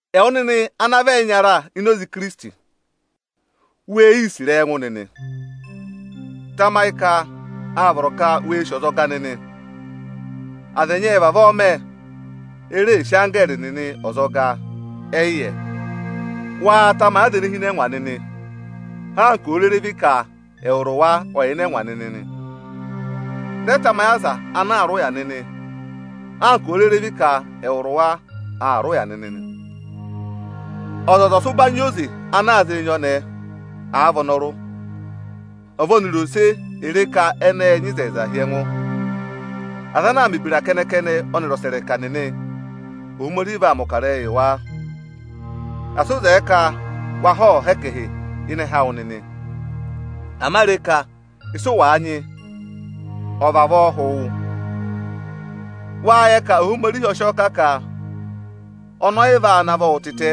Ẹwụ nịnị ana vị ẹyịnyara ini Ikirisiti, wee yii sì ịrẹyị ẹngụ nịnị! Tamayị ka áa vọrọ ka wee sì ọzọga nịnị! Aza ẹnyị ệ vavọọ mẹ, e reè sì anggẹẹrị nịnị ọzọga, ẹ yị yẹ. Waa tamayị aza ene hi ịnị ẹngwa nịnị, anka òo rere vị ka ẹwụrị wa ọ yà ịnị ẹngwa nịnị nị! Rẹ tamayị aza ana aa rị ụya nịnị, anka òo rere vị ka ẹwụrị wa aa rị ụya nịnị nị! Ọzọza ọ̀ sị ụbanyị yị oze ana a zịị nyị ọnẹẹ, àa vị ọnọrụ! Ẹvarose è re ka ẹnị ẹ́ẹ nyị ịzẹyịza hi ẹngụ! Aza ana aa mẹ̀ ebira kẹnẹ-kẹnẹ ọnịrị ọsẹrẹka nịnị, Ohomorihi vaa mẹ̀ ọkarẹyị yị wa. Asị ụ zẹẹ ka wa họ́họ̀ha ẹkẹhị ịnị ẹhẹ awụ nịnị! Ama re ka ịsị ụ wàa nyị, ọ́ọ vavọọ hụ wụ nịnị! Wáa yẹ ka Ohomorihi ọ sị ọọ kà ka ọnị ọ yị vaa navọ wụ nịnị tịtẹ,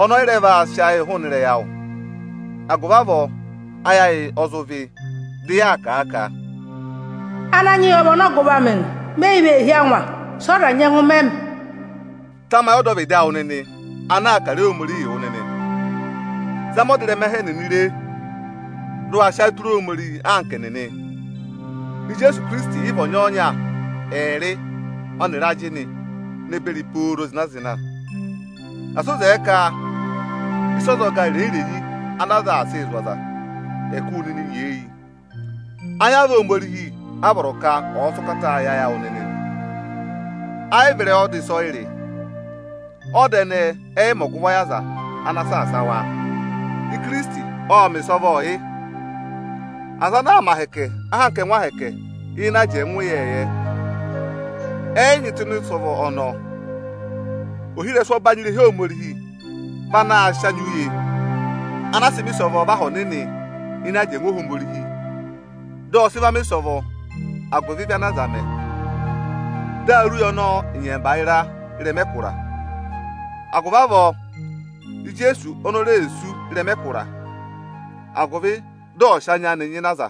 ọnị ọ yị rẹ vaa sị ayịị hụụnị ịrẹyị awụ nịnị. Agụvị avọọ ayị ayị ọ zụ vị́, dị yaa kà a ka, “Ananyị yị ọ vị ọnọgụvọ amị nị, me yi vee hí angwa. Sị ọza nyẹngụ mẹ mị?” Tamayị ọdọvịdị awụ nịnị ana kà ịrẹyị Ohomorihi wụ nịnị! Zama ọdịrẹma ẹhẹ ẹnịnị re, dị ụ wa sị ayị tụra Ohomorihi anka ẹnịnị! Ijeesu Ikirisiti yị vị ọnyọọnya ẹẹrị ọnịrị ajịnị ne beri pooro zịna-zịna. Asị ụ zẹẹ ka ịsa ọzọga irenyi-irenyi ana aza aa sịị zụ̀ aza, ẹ̀ kụ́ wụ nịnị nyeeyi! Ayamva Ohomorihi a vọrọ ka ọ̀ sị ụkata yị ayị awụ nịnị nị, ẹ yị vị ịrẹyị ọda ịsọyịrị. Ọda ẹnẹẹ ẹ yị mẹ ọgụvọ yị aza ana aa saasa wa. Ikirisiti ộ mẹ̀ ịsọvọọ yị. Aza ana aa mẹ ahẹkẹ anka ẹngụ ahẹkẹ ịnị ajẹngụ ịyẹẹyẹ, ẹ yị nyị tụ́ ịnị ịsọvọ ọnọọ. Ohirẹsụ ọbanyị irehi Ohomorihi vị anaā sịị anya uye ana a sị mẹ ịsọvọọ vẹ Aha Ọnịnị ịnị ajẹngụ Ohomorihi, dị ọ sị va mẹ̀ ịsọvọ agụvị ịvị ana aza mẹ. Dị a rị uye ọnọọ nyẹmba ịra ị́rẹma ẹkụra. Agụvị avọọ Ijeesu oni o re sú ị́rẹma ẹkụra, agụvị dị ọ̀ sị anya anị nyịna aza,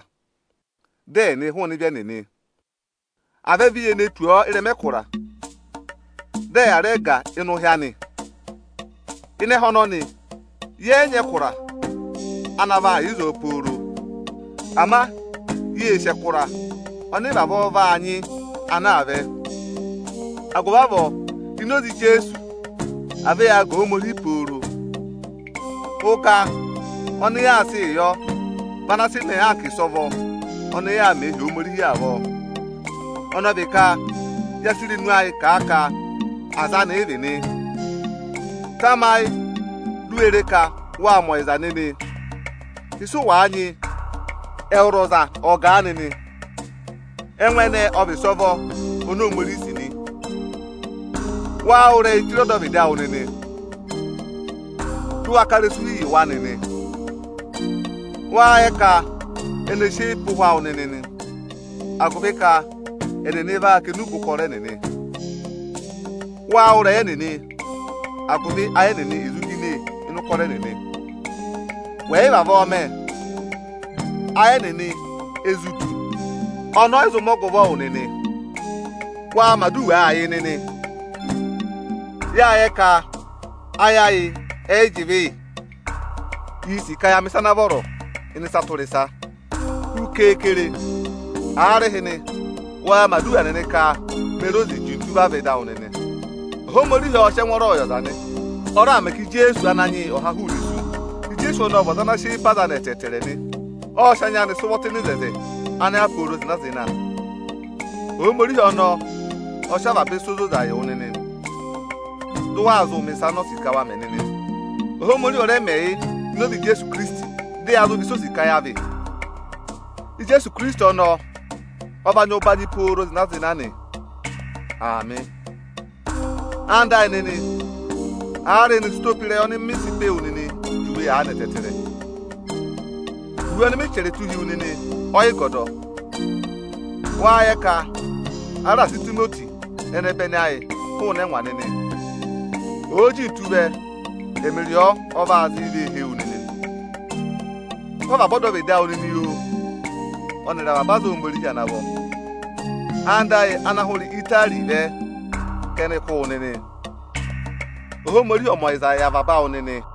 dị ẹ̀ nị hụụnị ịvị ẹnịnị. À vẹ vi ye ne tù ọ ịrẹma ẹkụra, dị ẹ yà rẹ gà ịnị ụhị anị! Ịnị ẹhẹ ọnọnị, yẹ yị nyị ẹkụra ana vaa yà ịzọọ pooro. Ama yee sì ẹkụra ọnị ị vavọọ vaa nyị ana aa vẹ. Agụvị avọọ ini oze Ijeesu, à vẹ yaa ga Ohomorihi pooro! Ụga ọnị yaa sịị yọ vị ana sị mẹẹ anka ịsọvọ ọnị yaa mẹẹ hi Ohomorihi avọọ. Ọnị ọ vi ka yaa sị irenu ayịị kà a ka aza anị ị vị nị. Tamayị di u we re ka waa mẹ ọyịza nịnị! Ịsị ụ wàa nyị, ẹwụrị ọza ọ̀ọ gàa nịnị! Ẹngụ ẹnẹẹ ọ vị ịsọvọ oni Ohomorihi sì nị. Waa wụ́ ịrẹyị chire ọdọvịdị awụ nịnị, dị ụ wa ká ịrẹsụ hi yị wa nịnị! Wáa yẹ ka ẹnị e sị eyi pe ụhwẹ awụ nịnị nị, agụvị ka ẹnịnị vaa kà enube ụkọrọ ẹnịnị. Waa wụ́ ịrẹyị ẹnịnị, agụvị ayị ẹnịnị è zụ hine ịnị ụkọrọ ẹnịnị. Wẹ̀ yị vavọọ mẹ, ayị ẹnịnị e zụ du, ọnọọ ọ́ yị zụ mẹ ọgụvọ wụ nịnị. Waa mẹ̀ aduwaa yị nịnị! Yáa yẹ ka ayị ayị ẹ yị jị ịvị yị. Iī sì ka ya mẹ̀ ịsa ana vọrọ ịnị ịsa tụra ịsa. Hu keekere, aarịhịnị waa mẹ̀ aduwa nịnị ka me re oze jintu vavẹ ịdị awụ nịnị! Ohomorihi ọọ̄ sị ẹngwọọrọ yị ọza nị. Ọ raà mẹ ka Ijeesu Ananyị yị ọ̀ ha hụụnị isu. Ijeesu ọnọọ ọ vị ọza ana sị eyi pe aza anị ẹtẹẹtẹrẹ nị. Ộ sị anya anị sị ụvọ tụ́ ịnị oto ana yà pooro zịna-zịna. Ohomorihi ọnọọ ọ̀ sị avaba ịsa ozoza yị wụ nịnị, dị ụ wa zụ mẹ̀ ịsa oni o sì ka wa mẹ nịnị! Ohomorihi ọ̀ rẹ mẹ yị ini oze Ijeesu Ikirisiti, dị ya zụ vị ịsị o sì ka ya vị. Ijeesu Ikirisiti ọnọọ ọ vaa nyị ụbanyị pooro zịna-zịna nị. Aamị. Ẹwụ nịnị ẹyịnyara amị, aarịhịnị sị ụtọ pe ịrẹyị ọnị mị sị pe wu nịnị juwe aanị ẹtẹẹtẹrẹ! Iwe ọnị mị chẹrẹ tụ́ hi wu nịnị ọ yị gọdọ. Wáá yẹ ka a raà sị Itimoti ẹnẹbẹnị ayị hụụnị ẹngwa nịnị? Òo jintu vẹ, ẹmịrị ọ, ọ vaa zị vee hee wu nịnị nị. Kụ́ avaba ọdọvịdị awụ nịnị, ọnịrị avaba aza Ohomorihi ana vọ! Anda ayị ana hụrẹ Itari vẹ ka ẹnị kụ́ wụ nịnị o. Ohomorihi ọ̀ mẹ ọyịza yị avaba awụ nịnị!